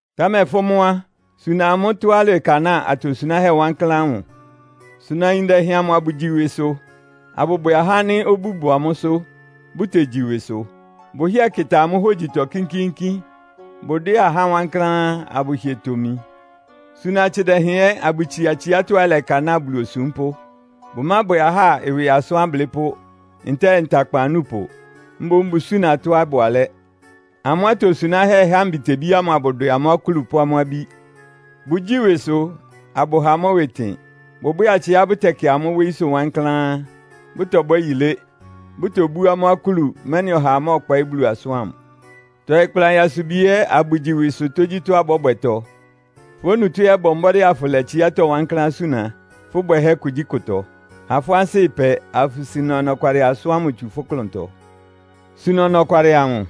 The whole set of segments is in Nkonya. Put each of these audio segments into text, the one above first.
Támɛ fʋ́ mʋ́ á, suna amʋ́ tɔ́á ɩlɛkanáa atosunáhɛ́ wankláán ámʋ. Suna ayin dɛhɛn amʋ abʋgyi ɩwɩsʋ, abʋbwɛ ahá ánɩ́ obú bʋ amʋ́sʋ́, bʋtegyi ɩwɩsʋ. Bʋhɩ́ɛ kɩta amʋ́ hógyitɔ kínkíínkín. Bʋdwɛ́ɛ ahá wankláán, abʋhɩɛ tomi. Suna atsɩ dɛhɛn ɛ́ abʋtsia tsiátɔ́á ɩlɛkanáa Bulu osúmpʋ́. Bʋmábwɛ ahá ɩwɩ asʋ́n ablɩ́pʋ́, ntɛ́ɛ ntakpan anúpʋ. Mboún bʋsúna tɔ́á ɩbʋ alɛ́. Amʋ́ atosunáhɛ́ ɩha mbitebí ámʋ abʋdwɛ amʋ́ akúlu pʋ́ amʋ́ abí. Bʋgyíi ɩwɩsʋ, abʋha amʋ́ ɩwɩ ɩtɩn. Bʋbwɛ́ɛ atsɩá bʋtɛkɩ amʋ́ wóyísʋ́ wankláán, bʋtɔbwɛ́ yilé, bʋtobú amʋ́ akúlu, mɛ́nɩ ɔhaa mɔ́ɔkpɔɩ́ Bulu asʋ́n ámʋ. Tɔɩ kpla nyasubi ɛ́ abʋgyi ɩwɩsʋ tógyítɔ́á bɔ́bwɛtɔ. Fʋ́ onutó ɛ́ bɔ mbɔ́dɩ́ afʋlɛ tsiátɔ́ wankláán suna, fʋ́ bwɛhɛ́ kugyíkʋtɔ. Ha fʋ́ ansɩ́ ɩpɛ, afʋsuna ɔnɔkwalɩ asʋ́n ámʋ tsu fʋ́ klʋntɔ. Suna ɔnɔkwalɩ amʋ,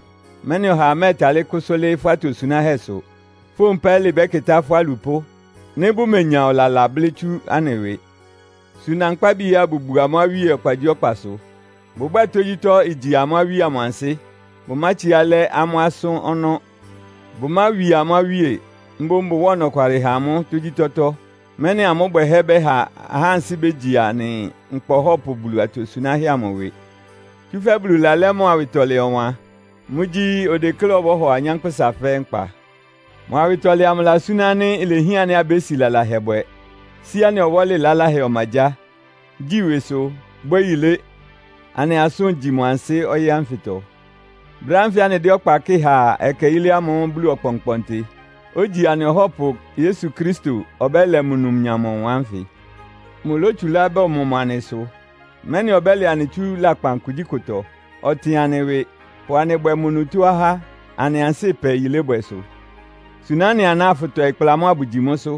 mɛ́nɩ ɔhaa mɛ́ɛtalɩ́ kʋsʋ́ lɩ́ɩ́ fʋ́ atosunáhɛ́sʋ. Fówun pɛ́lɩ bɛ́kɩtá fʋ́ alupʋ́, nɩ́ bʋmenya ɔlala blɩ́ tsú anɩ ɩwɩ. Suna nkpábi ɛ́ abʋbu amʋ́ awíe ɔkpagyíɔkpasʋ. Bʋbwɛ́ɛ tógyítɔ́ igyi amʋ́ awíe amʋ ansɩ́. Bʋmátsiá lɛ́ amʋ́ asʋ́n ɔnɔ́. Bʋmáwi amʋ́ awíe, mboún bʋwáa ɔnɔkwalɩ ha amʋ́ tógyítɔ́tɔ́, mɛ́nɩ amʋ́ bwɛhɛ́ bɛ́ha ahá ansɩ́ bégyi anɩ nkpa Ɔhɔ́pʋ Bulu atosunáhɛ́ amʋ ɩwɩ. Tsúfɛ́ Bulu lalɛ́ mʋ awɩtɔlɛ ɔwan. Mʋ́gyí, odekléá ɔbɔ́hɔ anyánkpʋ́sa fɛ́ɛ́ nkpa. Mʋ awɩtɔlɛ amʋ ɩlasúná ánɩ́ ilehián ánɩ́ abési lalahɛ bwɛ, sí anɩ ɔwɔ́lɩ laláhɛ ɔmagyáa, gyi ɩwɩsʋ, bwɛ́ yilé, anɩ asʋ́n igyi mʋ ansɩ́ ɔyɩ́ ánfɩtɔ. Brɛ́ ánfɩ anɩdɛ́ ɔkpa kɩ́ɩ há ɛkɛ yílé ámʋ́ʋ́ Bulu Ɔkpɔnkpɔntɩ, ogyi anɩ Ɔhɔ́pʋ Yesu Kristo ɔbɛ́lɛ mʋ numnyam ɔwan ánfɩ. Mʋlótsulá bɔmɔ mʋ anɩ sʋ, mɛ́nɩ ɔbɛ́lɛ anɩ tsú lakpan kugyíkʋtɔ. Ɔtɩn anɩ ɩwɩ, pʋ anɩ bwɛ mʋ onutó ahá, anɩ ansɩ́ ɩpɛ yilébwɛsʋ. Suna ɩ́nɩ aná, afʋtɔɩ kpla amʋ́ abʋgyi mʋ́sʋ́.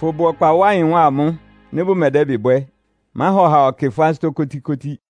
Fʋbʋ ɔkpa wá ɩyɩn wá amʋ́, nɩ́ bʋmɛdɛ́bɩ bwɛ́. Máha ɔhaa ɔkɩ fʋ́ ansɩ́tɔ́ kótíkótí.